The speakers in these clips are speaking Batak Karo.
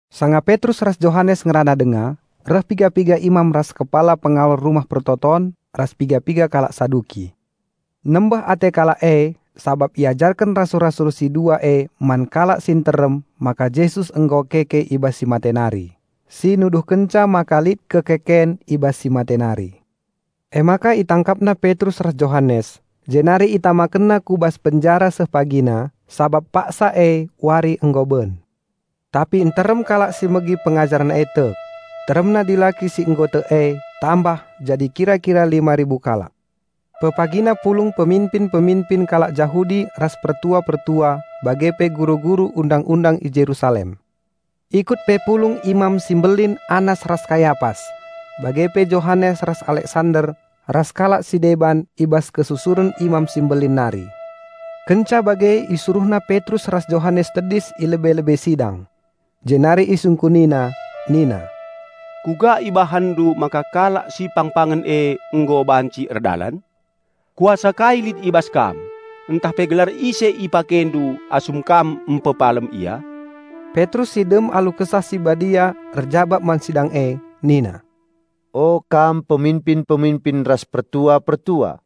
Sanga Petrus ras Johanes ngerana denga, reh piga-piga imam ras kepala pengawal Rumah Pertoton ras piga-piga kalak Saduki. Nembeh ate kalak e sabap iajarken rasul-rasul si dua e man kalak si nterem maka Jesus nggo keke i bas si mate nari, si nuduhkenca maka lit kekeken i bas si mate nari. Emaka itangkapna Petrus ras Johanes, jenari itamakenna ku bas penjara seh pagina, sabap paksa e wari nggo ben. Tapi nterem kalak si megi pengajaren e tek; teremna dilaki si nggo tek e tambah jadi kira-kira lima ribu kalak. Pepagina pulung peminpin-peminpin kalak Jahudi ras pertua-pertua bage pe guru-guru Undang-undang i Jerusalem. Ikut pe pulung Imam si Mbelin Annas ras Kayapas, bage pe Johanes ras Aleksander ras kalak si deban i bas kesusuren Imam si Mbelin nari. Kenca bage isuruhna Petrus ras Johanes tedis i lebe-lebe sidang. Jenari isungkunina nina, "Kuga ibahanndu maka kalak si pangpangen e nggo banci erdalan? Kuasa kai lit i bas kam ntah pe gelar ise ipakendu asum kam mpepalem ia?" Petrus si dem alu Kesah Si Badia erjabap man sidang e nina, "O kam peminpin-peminpin ras pertua-pertua.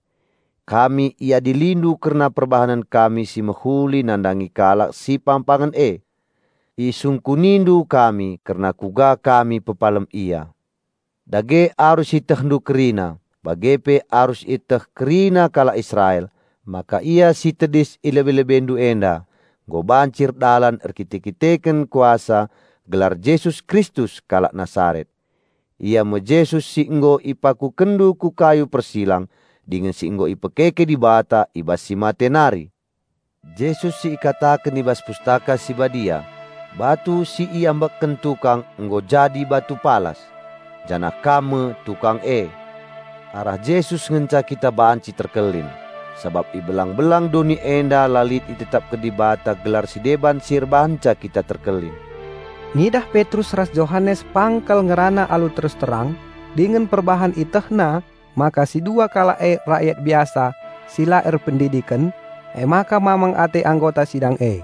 Kami iadilindu kerna perbahanen kami si mehuli nandangi kalak si pangpangen e. Isungkunindu kami kerna kuga kami pepalem ia. Dage arus ietehndu kerina bage pe arus ieteh kerina kalak Israel maka ia si tedis i lebe-lebendu enda nggo banci erdalan erkite-kiteken kuasa gelar Jesus Kristus kalak Nasaret. Ia me Jesus si nggo ipakukenndu ku kayu persilang dingen si nggo ipekeke Dibata i bas si mate nari. Jesus si ikataken i bas Pustaka Si Badia, 'Batu si iambekken tukang nggo jadi batu palas.' Janah kam me tukang e. Arah Jesus ngenca kita banci terkelin; sabap i belang-belang doni enda la lit itetapken Dibata gelar si deban si erbahanca kita terkelin." Ngidah Petrus ras Johanes pang kal ngerana alu terus terang, dingen perbahan ietehna maka si dua kalak e rakyat biasa si la erpendidiken, emaka mamang ate anggota sidang e.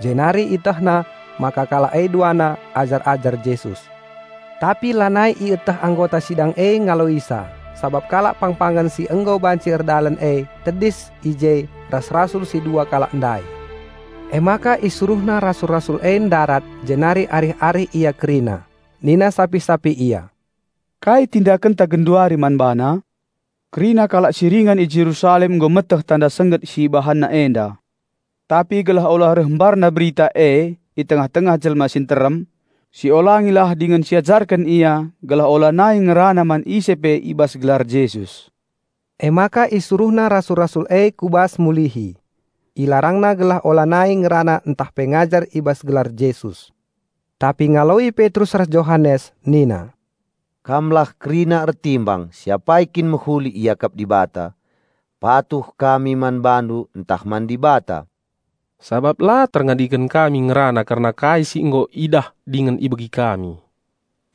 Jenari ietehna maka kalak e duana ajar-ajar Jesus. Tapi lanai ieteh anggota sidang e ngaloisa sabap kalak pangpangen si nggo banci erdalan e tedis i je ras rasul si dua kalak ndai. Emaka isuruhna rasul-rasul e ndarat jenari arih-arih ia kerina. Nina sapih-sapih ia, "Kai tindakenta genduari man bana? Kerina kalak si ringan i Jerusalem nggo meteh tanda sengget si ibahanna enda. Tapi gelah ula reh mbarna berita e i tengah-tengah jelma si nterem, siolangilah dingen siajarken ia gelah ulanai ngerana man ise pe i bas gelar Jesus." Emaka isuruhna rasul-rasul e ku bas mulihi. Ilarangna gelah ulanai ngerana ntah pe ngajar i bas gelar Jesus. Tapi ngaloi Petrus ras Johanes nina, "Kamlah kerina ertimbang si apai kin mehuli iakap Dibata: patuh kami man bandu ntah man Dibata. Sabap la terngadiken kami ngerana kerna kai si nggo idah dingen ibegi kami."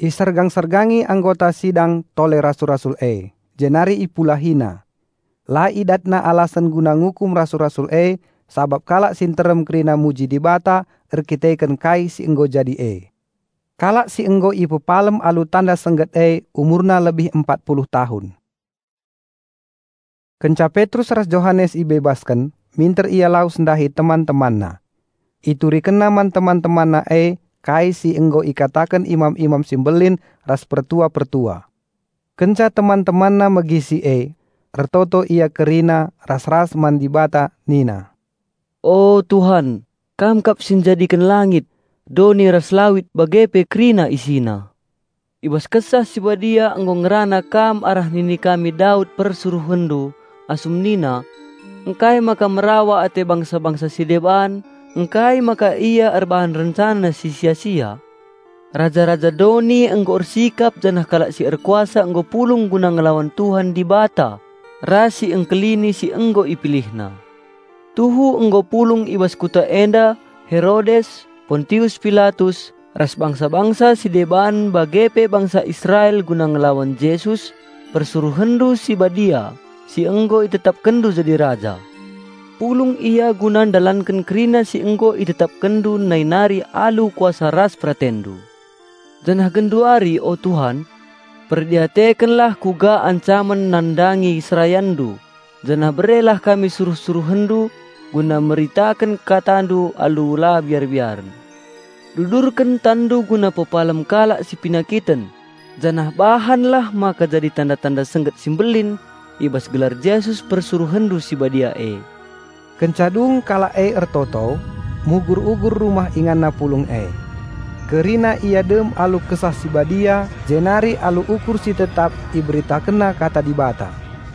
Isergang-sergangi anggota sidang tole rasul-rasul e, jenari ipulahina. La idatna alasen guna ngukum rasul-rasul e sabap kalak si nterem kerina muji Dibata erdandanken kai si nggo jadi e. Kalak si nggo ipepalem alu tanda sengget e umurna lebih empat puluh tahun. Kenca Petrus ras Johanes ibebasken, minter ia lawes ndahi teman-temanna. Iturikenna man teman-temanna e kai si nggo ikataken imam-imam si mbelin ras pertua-pertua. Kenca teman-temanna megi si e, ertoto ia kerina ras-ras man Dibata nina, "O Tuhan, Kam kap si njadiken langit, doni, ras lawit bage pe kerina isina. I bas Kesah Si Badia nggo ngerana Kam arah nini kami Daud PersuruhenNdu, asum nina, 'Ngkai maka merawa ate bangsa-bangsa si deban; ngkai maka ia erbahan rencana si sia-sia? Raja-raja doni nggo ersikap janah kalak si erkuasa nggo pulung guna ngelawan Tuhan Dibata ras Si Engkelini si nggo IpilihNa.' Tuhu nggo pulung i bas kuta enda Herodes, Pontius Pilatus ras bangsa-bangsa si deban bage pe bangsa Israel guna ngelawan Jesus, PersuruhenNdu si Badia, si nggo ItetapkenNdu jadi Raja. Pulung ia guna ndalanken kerina si nggo ItetapkenNdu nai nari alu kuasa ras PeratenNdu. Janah genduari, o Tuhan, perdiatekenlah kuga ancamen nandangi serayanndu, janah berelah kami suruh-SuruhenNdu, guna meritaken KataNdu alu la biar-biaren. Dudurken TanNdu guna pepalem kalak si penakiten janah bahanlah maka jadi tanda-tanda sengget si mbelin i bas gelar Jesus PersuruhenNdu si Badia e." Kenca dung kalak e ertoto, mugur-mugur rumah inganna pulung e. Kerina ia dem alu Kesah Si Badia jenari alu ukur si tetap iberitakenna kata Dibata.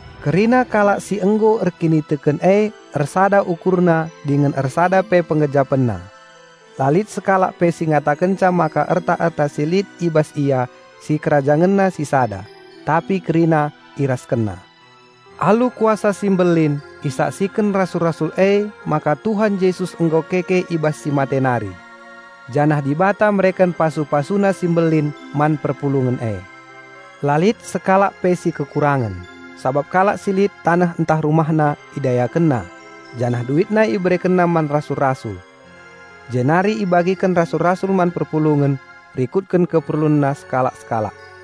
Kerina kalak si nggo erkiniteken e ersada ukurna dingen ersada pe penggejapenna. La lit sekalak pe si ngatakenca maka erta-erta si lit i bas ia, si kerajangenna sisada; tapi kerina iraskenna. Alu kuasa si mbelin isaksiken rasul-rasul emaka Tuhan Jesus nggo keke i bas si mate nari. Janah Dibata mereken pasu-PasuNa si mbelin man perpulungen e. La lit sekalak pe si kekurangen, sabap kalak si lit taneh ntah rumahna, idayakenna. Janah duitna iberekenna man rasul-rasul. Jenari ibagiken rasul-rasul man perpulungen rikutken keperlunna sekalak-sekalak.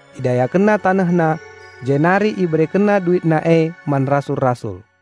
Idayakenna tanehna, jenari iberekenna duitna e man rasul-rasul.